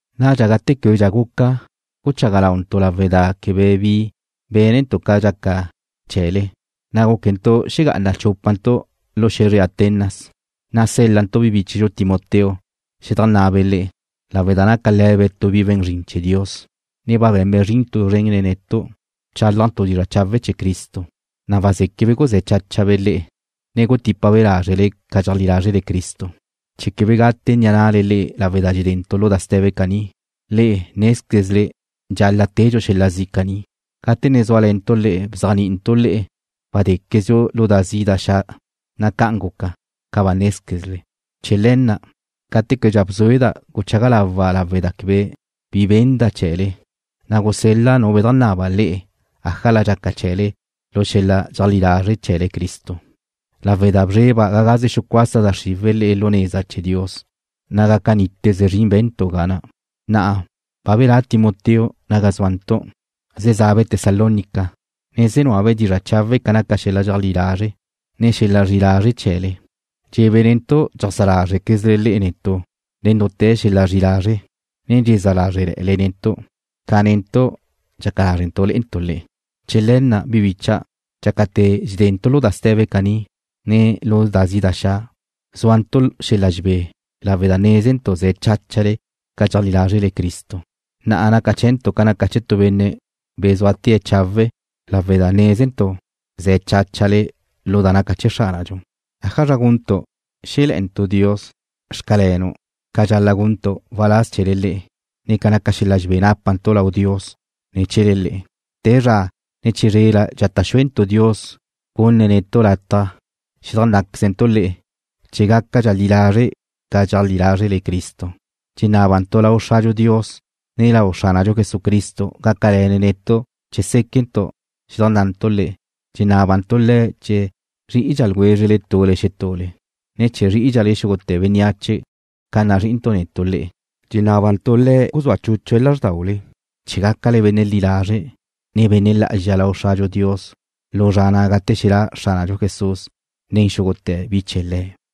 Nadxa gate québedxa guca guchaga launtu' lawe' da quebe bi bénentu' ca dxaca chee̱le, na' gúquentu' xegá'ana chúpantu' lu xe̱zre Atenas, na' sél-lantu' bi bíchedxu Timoteo xedajnná'abe' le'e, lawe' da naca le̱be' tu bi we̱n zrin chee̱ Dios, ne ba be̱nbe' zrin tu zren nen netu', bchálajntu' dizra' chawe' chee̱ Cristo, na' wazéquebe' guzé̱ cháchabe' le'e, ne gutípabe' lázrele ca dxeajlí lázrele Cristo, chee̱ quebe gate ni'a na'le lawe' da dxedentu' lu da ste̱be caní. Le'e nézquezle dxal-la' tedxu xel-la zi' caní. Gate ne zúale̱ntu' le'e bzéajni'intu' le'e wadéquezdxu lu da zi' da xa', na' ca'an guca, ca ba nézquezle. Chee̱ le̱ na', gate québedxa bzúeda' guchaga lawa' lawe' da quebe bi benda' chee̱le, na' gusel-la' nu bedajnaba le'e ájala dxaca chee̱le lu xel-la dxeajlí lazre' chee̱le Cristo, lawe' da bzreba' ga gaze xucuasa da xriwe̱' le'e lu neza chee̱ Dios, na' gaca níteze zrin be̱ntu' ga na'. Na'a ba belá' Timoteo ga ni zúantu', ze zabe' Tesalónica, ne ze núabe' dizra' chawe' ca naca xel-la dxeajlí lazre', ne xel-la zri'i lazre' chee̱le. Dxe̱be' netu' dxeajsá lázrquezle le'e netu' nen dute̱ xel-la zri'i lazre', ne dxezá lázrele̱'e̱le lé'ele netu', ca netu' dxaca lázrentu' le'entu' le'e. Chee̱ le̱ na', bi bicha', dxácate̱ dxedentu' lu da ste̱be caní, ne lu da zi' da xa', zúantu' xel-la dxebé lawe' da nézentu' ze̱ cháchale ca dxeajlí lázrele Cristo. Na'a naca chee̱ntu' ca naca chee̱ tu benne' bezúatee̱' chawe' lawe' da nézentu' ze̱ cháchale lu da naca chee̱ Xránadxu. ¿Ájazra guntu' xé̱le̱'e̱ntu' Dios: Xcalenu' ca dxal-la' guntu' waláz chee̱le le'e, ne ca naca xel-la dxebé nápantu' lau Dios ne̱ chee̱le le'e? Te zra, ne chizrela dxata' xúentu' Dios gunne̱' netu' lataj xedajnná'quezentu' le'e, chee̱ gácadxale li lazre' ca dxeajlí lázrele Cristo. Dxenábantu' lau Xradxu Dios, ne lau Xránadxu Jesucristo gácale̱ne̱' netu' chee̱ séquentu' xedajnná'antu' le'e. Dxenábantu' Le̱' chee̱ zrí'idxa ljwézrele tule xetule, ne chee̱ zrí'idxale xúgute̱ bénneache ca nazrí'intu' netu' le'e. Dxenábantu' Le̱' guzúa chúchue̱' lázrdaule, chee̱ gácale benne' li lazre', ne benne' lá'azxa lau Xradxu Dios lu zra na' gate xelá' Xránadxu Jesús nen xúgute̱ bi chee̱ Le̱'.